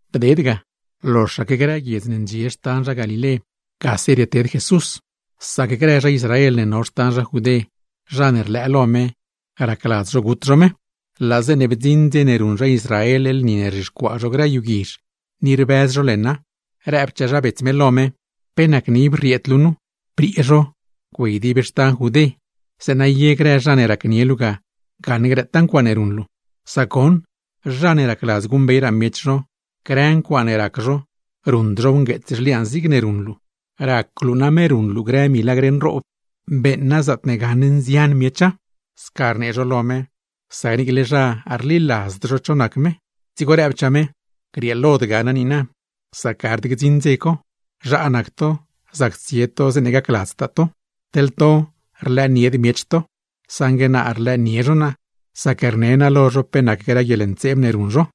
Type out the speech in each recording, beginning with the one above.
Bded ga, loxaque grë guiedz ne ndxie xtan zha Galilé, gase rieted Jesús. Sac grë zha Israel ne no xtan zha Judé, zha ne rlëë lo me, racladz zho gut zho me. Laa zeeṉe bdziṉ dze ne ruṉ zha Israel lni ne rzhixcuaa zho grë yu guizh, ni rbëz zho leṉa; rëbchaa zha bets me lo me: ―¿Pe nacne ib rrieed luu nu? Briee zho, güey dib xtan zha Judé, zeeṉa ye grë zha ne racnie luu ga gaṉ grëtaa ncuaaṉe ruṉ luu. Sac goṉ, zha ne racladz guṉbeyraa miech zho, grë ncuaaṉe rac zho, ruṉd zhow ngueets zhliaan zigne ruṉ luu. Rac luu name ruṉ luu grë milagr nroob, beeṉa zaatne gaṉ nzian miecha. Sca rnee zho lo me, sac niicle zha rliladzd cho nac me; dzigo rëbchaa me: ―Grieelod ga naa niina, sac gard gdziṉ dze co; zhaa nac to, zac tsie to zeeṉe gacladztaa to. Teḻ to, rlëënied miech to; saṉgue naa rlëënie zho naa, sac rne naa lo zho pe nac grë guieḻntseeb ne ruṉ zho.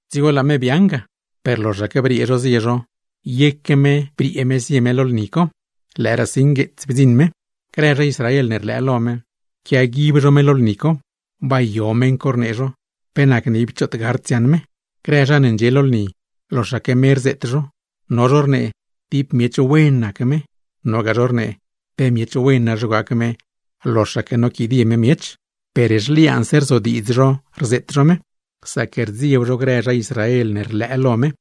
Dzigo laa me biaaṉ ga. Per loxaque briee zho zie zho, yeque me briee zie me; lëëraasi ngueetsse bdziṉ me. Grë zha Israel ne rlëë lo me, quiaguib zho me lo lni co. ―¿Bay yo meṉ co? ―rnee zho―. ¿Pe nacne ib choot gard dziaṉ me? Grë zha ne ndxie lo lni, loxaque me rzeet zho. No zho rnee: “Tib miech wen nac me”; nogaa zho rnee: “Pe miech wen na zho gac me, loxaque noquidie me miech.” Per zhliaanse rzodiidz zho rzeet zho me, sac rdzieb zho grë zha Israel ne rlëë lo me.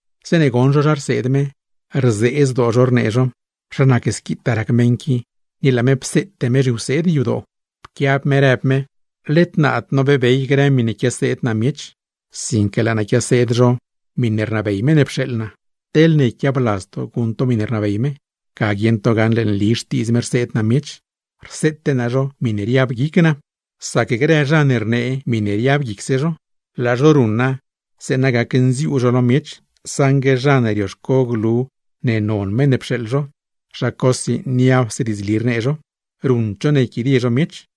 Zeeṉe goṉ zho zha rseed me, rzee zdoo zho rnee zho: ―¿Zha nac squitaa rac meṉ qui, ni laa me pseete me grë zhiwseed yadoo? Pquiab me rëb me: ―Led naad nobeebey grë miṉe quiaseed naa miech, sinque laa naa quiaseed zho miṉe rnabey meṉ ne pxeeḻ naa. Teḻne yquiabladz to guṉ to miṉe rnabey me, ga guieṉ to dieṉ pe nli xtiidz Dios rseed naa miech, te miṉe riab guic naaw ye. Sac grë zha ne rnee grë miṉe riab guicse zho, laa zho ruṉa zeeṉa gacnziuu zho lo miech; saṉgue zha ne rioxco glu ne non meṉ ne pxeeḻ zho, zha cosi niapse diidzli rnee zho, ruṉd zho ne yquidie zho miech.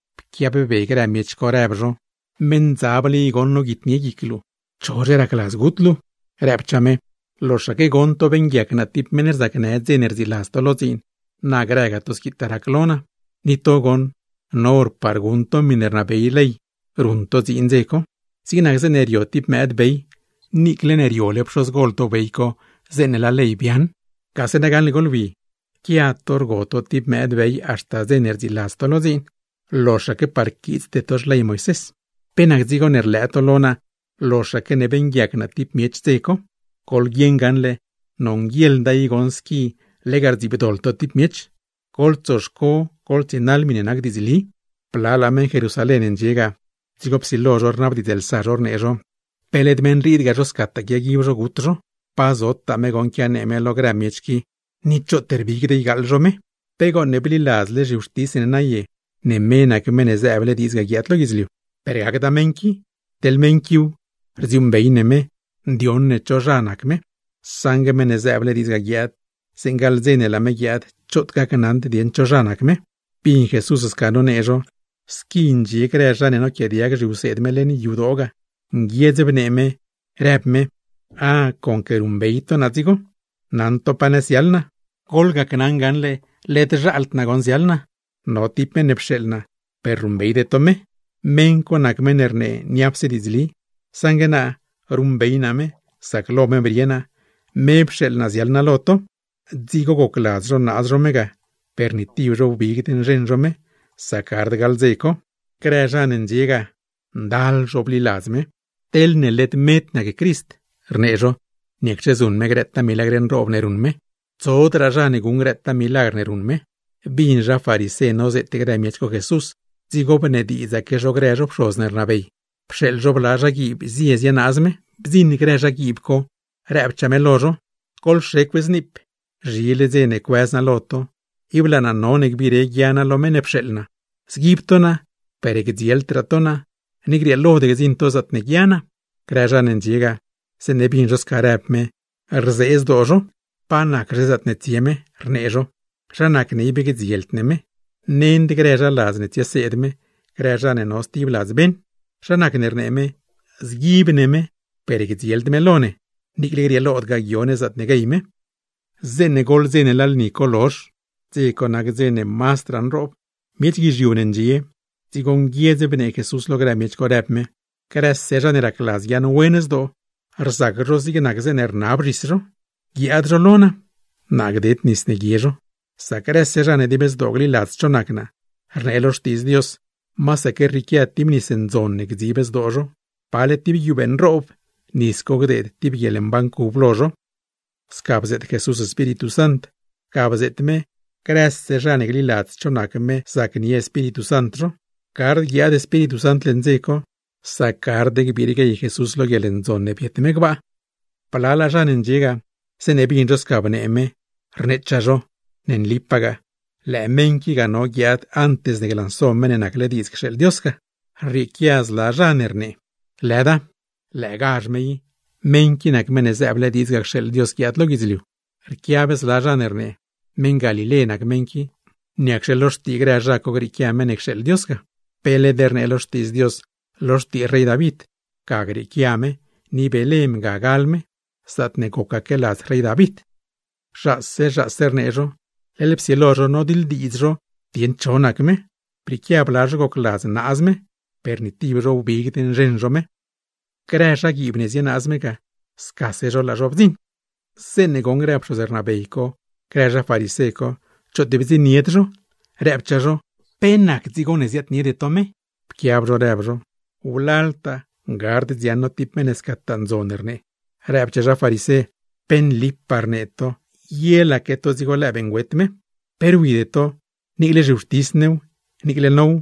Pquiab be grë miech co, rëb zho: ―¡Meṉdzable i goṉ noguitnie guic luu! ¿Chozhe racladz gut luu? Rëbchaa me: ―Tib vuelt, loxaque goṉ to beeṉguiac naa tib meṉ rzacnë dze ne rdziiladz to lo dziin, na grëga to squitaa rac lo naa. Ni to goṉ, no hor par guṉ to miṉe rnabey ley ruṉ to dziin dze co; zig nac zeeṉe rio tib mëëd bey (niicle ne riole pxozgol to bey co, zeeṉe laa ley biaaṉ). ¡Gase na gaṉle goḻwi! Rquia to rgo to tib mëëd bey haxta dze ne rdziiladz to lo dziin, loxaque par quiitsde to xley Moisés. ¿Pe nac dzigo ne rlëë to lo naa loxaque ne beeṉguiac naa tib miech dze co? Goḻguieṉ gaṉle, nonguieḻd ne lega gdziibdoḻ to tib miech. Goḻtsoxco goḻtsienaḻ miṉe nac diidzli. Blalaa meṉ Jerusalén ndxie ga, dzigo psilo zho rnabdiidzlsa zho rnee zho: ―¿Pe led meṉ riid ga zho scataa quiaguib zho gut zho? Pa zotaa me goṉ quianee me lo grë miech qui, ni choot peet ruṉd me. ¿Pe gooṉ bliladzle zhiwxtis ne naye ne me nac Meṉ ne zëëble diidz ga guiaad lo guidzliu? Per gacda meṉ qui. Teḻ meṉ quiw, rdziuuṉbey ne me, ndioṉ ne cho zha nac me; saṉgue Meṉ ne zëëble diidz guiaad ga, zeeṉe gaḻ dze ne laa me guiaad, choot gacnaṉd dieṉ cho zha me. Bin Jesús sca nonee zho. Squi ndxie grë zha ne noquiaadiag zhiwseed me leṉ yadoo ga, nguiedz bnee me rëbchaa me: ―Ah, conque ruṉbey to naa dzigo, ¡naṉ to pa nëz ziaḻ naa! Per led zhaald naa goṉ ziaḻ naa, no tib meṉ ne pxeeḻ naa per ruṉbeyde to me; meṉ co nac meṉ ne rnee niapse diidzli. Saṉgue naa ruṉbey naa me, sac lo me brie naa, me pxeeḻ naa ziaḻ naa lo to. Dzigo gocladz zho naaz zho me ga, per ni tib zho wbigd nzheṉ zho me; sac gard gaḻ dze co. Grë zha ne ndxie ga, ndal zho bliladz me. ―Teḻne led med nac Crist ―rnee zho―, niacxe zuṉ me grëtaa milagr nroob ne ruṉ me. ¡Tsodraa zha ne guṉ grëtaa milagr ne ruṉ me! Bin zha farisé nozeet grë miech co Jesús, dzigo bnediidzaque zho grë zho pxoz ne rnabey, pxeeḻ zho bla zhaguiib zie zienaaz me. Bdziṉ grë zhaguiib co, rëbchaa me lo zho: ―¡Goḻxecw zniip! Zhile dze ne cuëz naa lo to; ib laa naa none gbiire guia naa lo meṉ ne pxeeḻ naa. Zguib to naa, per gdzieldraa to naa, ni grieelod gdziṉ to zaatne guia naa. Grë zha ne ndxie ga, zeeṉe bin zho sca rëb me, rzee zdoo zho. ―¿Pa naczhe zaatne tsie me? ―rnee zho―. ¿Zha nacne ib gdzield ne me? Nend grë zha ladz ne tsieseed me, grë zha ne no stib ladz beṉ. ¿Zha nacne rnee me, zguib ne me per gdzield me lo ne, niicle grieelodgaa guio ne zaatne guey me? Zeeṉe goḻ dze ne laa lni co lozh (dze co nac dze ne mazdraa nroob), miech guizhiu ne ndxie; dzigo nguiedz bnee Jesús lo grë miech co, rëb me: ―Grëse zha ne racladz guiaaṉwen zdoo, rzac zho zig nac zeeṉe rnab zhis zho, guiaad zho lo naa, naa gded nis ne guie zho. Sac grëse zha ne dib zdoo gliladz cho nac naa, rnee lo Xtiidz Dios, masaque rrieequia tib nis ndzon ne gdzib zdoo zho, pale tib guiubee nroob; nis co gdeed tib guieḻmban cub lo zho. Sca bzeet Jesús Espíritu Sant. Ga bzeet me, grëse zha ne gliladz cho nac me zacnie Espíritu Sant zho. Gard guiaad Espíritu Sant leṉ dze co, sac gard gbire Jesús lo guieḻndzon ne no me gbaa hor co. Blalaa zha ne ndxie ga, zeeṉe bin zho sca bnee me, rneechaa zho: ―Ne nlipagaa, lëë meṉ qui ga no guiaad antes ne glanso Meṉ ne nacle diidz cxeeḻ Dios ga. Rrieequia zla zha ne rnee: ―¡Lëda! ¡Lëëgazh me i! Meṉ qui nac Meṉ ne zëëble diidz ga cxeeḻ Dios guiaad lo guidzliu. Rquiab zla zha ne rnee: ―Meṉ Galilé nac meṉ qui. ¿Niacxe lo xtii grë zha co grieequia Meṉ ne cxeeḻ Dios ga? Pe led rnee lo Xtiidz Dios lo xtii rey David, ga grieequia me ni Belén ga gal me, zaatne gocaque ladz rey David. Zhaase zhaase rnee zho; leḻ psilo zho nodiḻdiidz zho dieṉ cho nac me. Brieequia bla zho gocladz naaz me, per ni tib zho wbigd nzheṉ zho me. Grë zhaguiib ne zienaaz me ga, scase zho laa zho bdziṉ. Zeeṉe goṉ grë pxoz rnabey co, grë zha farisé co choot bdziṉnied zho, rëbchaa zho: ―¿Pe nac dzigo ne ziaadniede to me? Pquiab zho rëb zho: ―¡Wlaltaa gard dziaṉ no tib meṉ ne scataa ndzon rnee! Rëbchaa zha farisé: ―¡Pe nlipaa rnee to! ¿Yelaque to dzigo beeṉgüet me? ¿Pe rwide to, niicle zhiwxtis new, niicle now,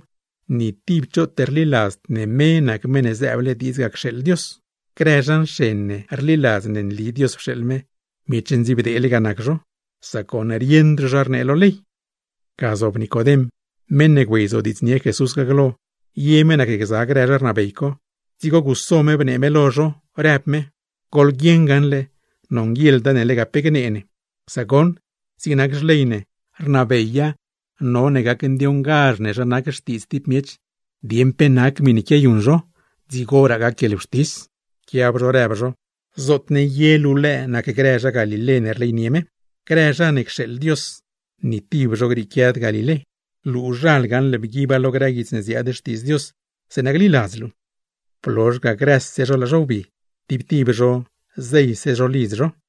ni tib choot rliladzd ne me nac Meṉ ne zëëble diidz cxeeḻ Dios ga? Grë zha nxen ne rliladz ne nli Dios pxeeḻ me, ¡miech ndziibdeele nac zho, sac goṉ rieṉd zho zha rnee lo ley! Ga zob Nicodem, meṉ ne güeyzodiidznie Jesús ga glo, ye me nacgza grë zha rnabey co, dzigo guso me bnee me lo zho, rëb me: ―Goḻguieṉ gaṉle nonguieḻda ne lega pe gnee ne. Sac goṉ, zig nac xley ne, rnabeya none gacndioṉgazh ne zha nac xtiidz tib miech, dieṉ pe nac miṉe quiayuṉ zho, dzigoraa gac guieḻwxtis. Pquiab zho rëb zho: ―¿Zootne ye luu lëë nacgza grë zha Galilé ne rleynie me? ¡Grë zha ne cxeeḻ Dios, ni tib zho grieequiad Galilé! ¡Luuzhal bguiba lo grë guits ne ziaad Xtiidz Dios gaṉle, zeeṉa gliladz luu! Blozh ga, grëse zho laa zho wbi, tib tib zho zeyse zho lidz zho.